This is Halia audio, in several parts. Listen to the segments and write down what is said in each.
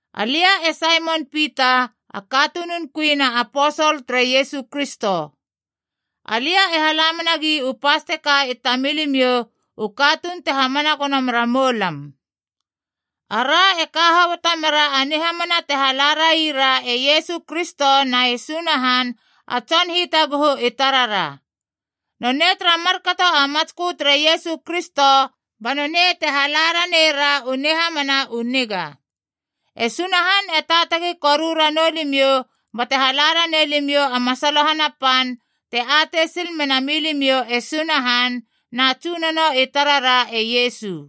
Alia e Saimon Pita, a katunun kui na aposol tere Iesu Kristo. Alia e hala menagi u pas teka i tamilimiou u katuun te hamana gono mera moulam. Ara e ka hoboto mera a nihamana te hala raira e Iesu Kristo na e Sunahan a Tson Hitaguhu i tarara. Nonei tara markato a matskö tere Iesu Kristo ba nonei te hala ranei ra u nihamana u niga. E Sunahan e taatagi koru ranou limiou bate hala ranei limiou a masalohana pan te atei sil mena milimiou e Sunahan, na Tsunono i tarara e Iesu.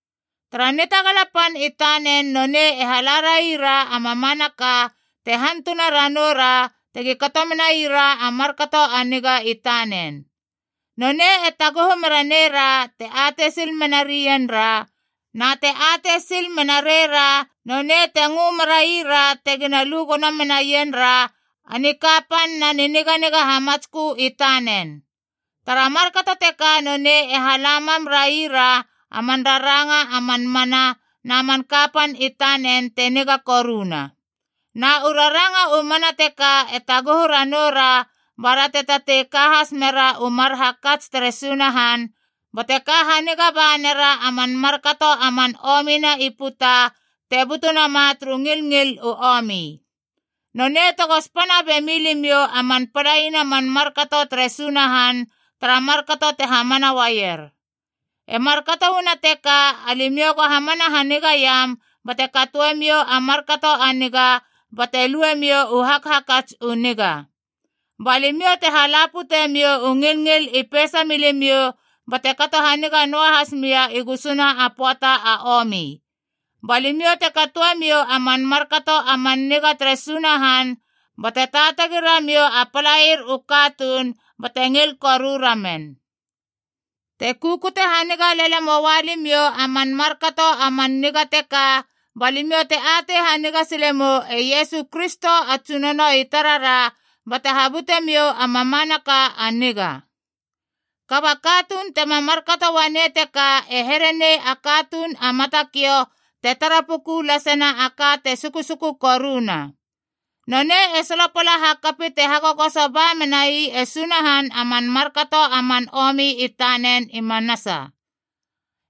Tara nitagala pan i tanen nonei e hala raira a mamanaka te hantuna ranou ra tegi kato menai ra a markato a niga i tanen. Nonei e taguhu mera neira te atei sil mena reien ra, na te atei sil mena reira nonei te ngö meraira tegina lu gono menaien ra a nikapan na niniganiga hamatskö i tanen. Tara markato teka nonei e hala mam raira a man raranga a man mana na man kapan i tanen te niga koruna. Na u raranga u mana teka e taguhu ranou ra bara te tatei ka has mera u mar hakats tere Sunahan, bate ka haniga ba nera a man markato a man omina i puta te butu nama turu ngilngil u omi. Nonei tego spana bemi limiou a man palaina man markato tere Sunahan tara markato te hamana uaier. E markato uana teka, alimiou go hamana hanigaiam bate katoemiou a markato a niga bate luemiou u hakhakats u niga. Ba limiou te hala putemiou u ngilngil i peisa milimiou bate kato haniga noahas mia i gusuna a pöata a omi. Ba limiou te katoemiou a man markato a man niga tere Sunahan, bate taatagi ramiou a palair u katuun bate ngil koru ramen. Te kukute haniga lele moua limiou a man markato a man niga teka, ba limiou te atei haniga sile mou e Iesu Kristo a Tsunono i tarara bate habutemiou a mamanaka a niga. Kaba a katuun tema markato uanei teka e here nei a katuun a matakiou te tara puku lasena a ka te susuku koruna. Nonei e solopala hakapi te hagogoso ba menai e Sunahan a man markato a man omi i tanen i manasa.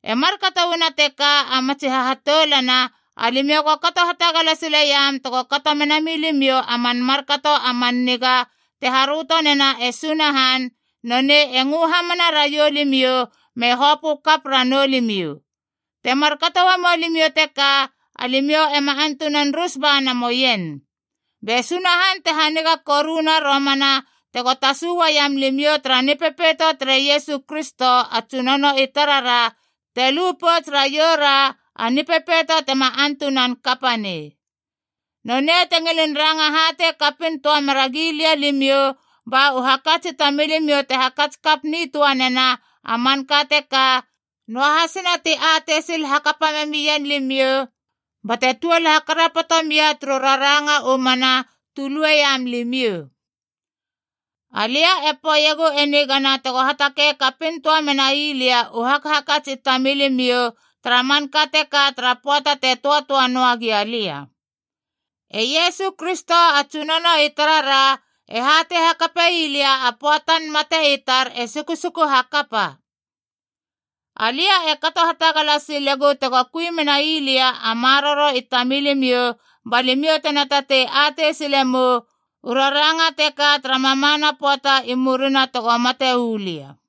E markato uana teka, a matsi hahatoulana, alimiou go kato hatagala sileiam tego kato mena milimiou a man markato a man niga te haröto nena e Sunahan, nonei e ngö hamana raiou limiou me hopö kap ranou limiou. Te markato uamou limiou teka, alimiou ema antunan rus ba namoien. Be Sunahan te haniga koruna romana tego tasu uaiam limiou tara Nipepeito tere Iesu Kristo a Tsunono i tarara te lu pouts raiou ra, a Nipepeito tema antunan kapa nei. Nonei te ngilin ranga hatei kapin töa mera gilia limiou ba u hakats i tamilimiou te hakats kap nitöanena a manka teka, noahasina ti atei sil hakapa memien limiou bate tuol hakarapoto mia turu raranga u mana tu lueiam limiou. Alia e poeiegu e nigana tego hatakei kapin töa menai lia u hakhakats i tamilimiou tara manka teka tara pöata te töatöa noa gia lia. E Iesu Kristo a Tsunono i tarara e hatei hakapei lia a pöatan mate i tar e sukusuku hakapa. Alia e kato hatagala sile gou tego kui menai lia a maroro i tamilimiou, ba limiou tena tatei atei silemou u raranga teka tara mamana pöata i murina tego mate uu lia.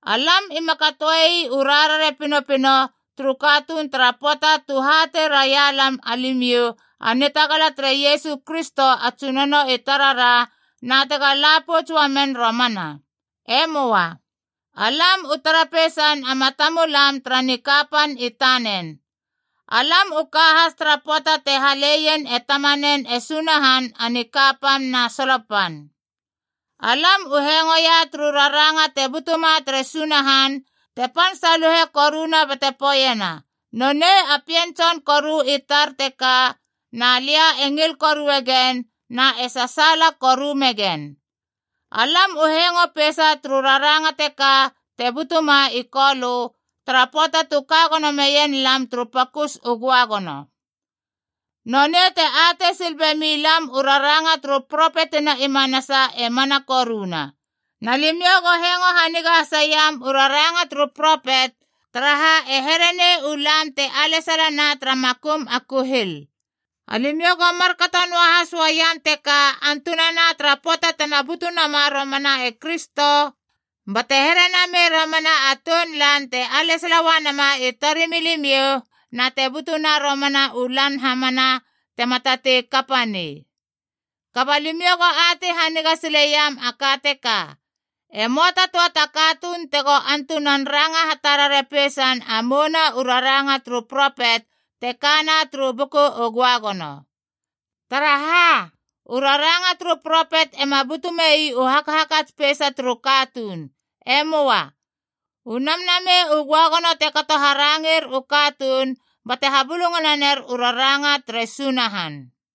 Alam ima katoei u rarare pinopino turu katuun tara pöata tu hatei raia lam alimiou a nitagala tere Iesu Kristo a Tsunono i tarara, na tega la pouts uamen romana. E möa. Alam u tara peisan a matamulam tara nikapan i tanen. Alam u ka has tara pöata te haleien e Tamanen e Sunahan a nikapan na solo pan. Alam u hengoia turu raranga te butuma tere Sunahan te pan saluhe koruna bate poeiena, “Nonei a Pien Tson koru i tar teka. Na lia e ngil korue gen, na e sasaala koru megen.” Alam u hengo peisa turu raranga teka te butuma i Kolö, tara pöata tu ka gono meien lam turu pokus u göagono. Nonei te atei sil bemi lam u raranga turu propetina i manasa e mana koruna. Na limiou go hengo haniga haseiam u raranga turu propet, taraha e here nei u lam te alesalana tara makum a kuhil. Alimiou go markato noahas uaiam teka antunana tara pöata tena butu nama romana e Kristo, bate here namei romana a tounlan te alesala uanama i torimilimiou, na te butuna romana u Lan hamana tema tatei kapa nei. Kaba limiou go atei haniga sileiam a ka teka: e möa ta töa ta katuun tego antunan ranga hatarare peisein a mouna u raranga turu propet te kana turu Buku u Göagono. Taraha, u raranga turu propet ema butu mei u hakhakats peisa turu katuun. E möa. U Namnamei u Göagono te kato haranger u katuun bate habulungana ner u raranga tere Sunahan.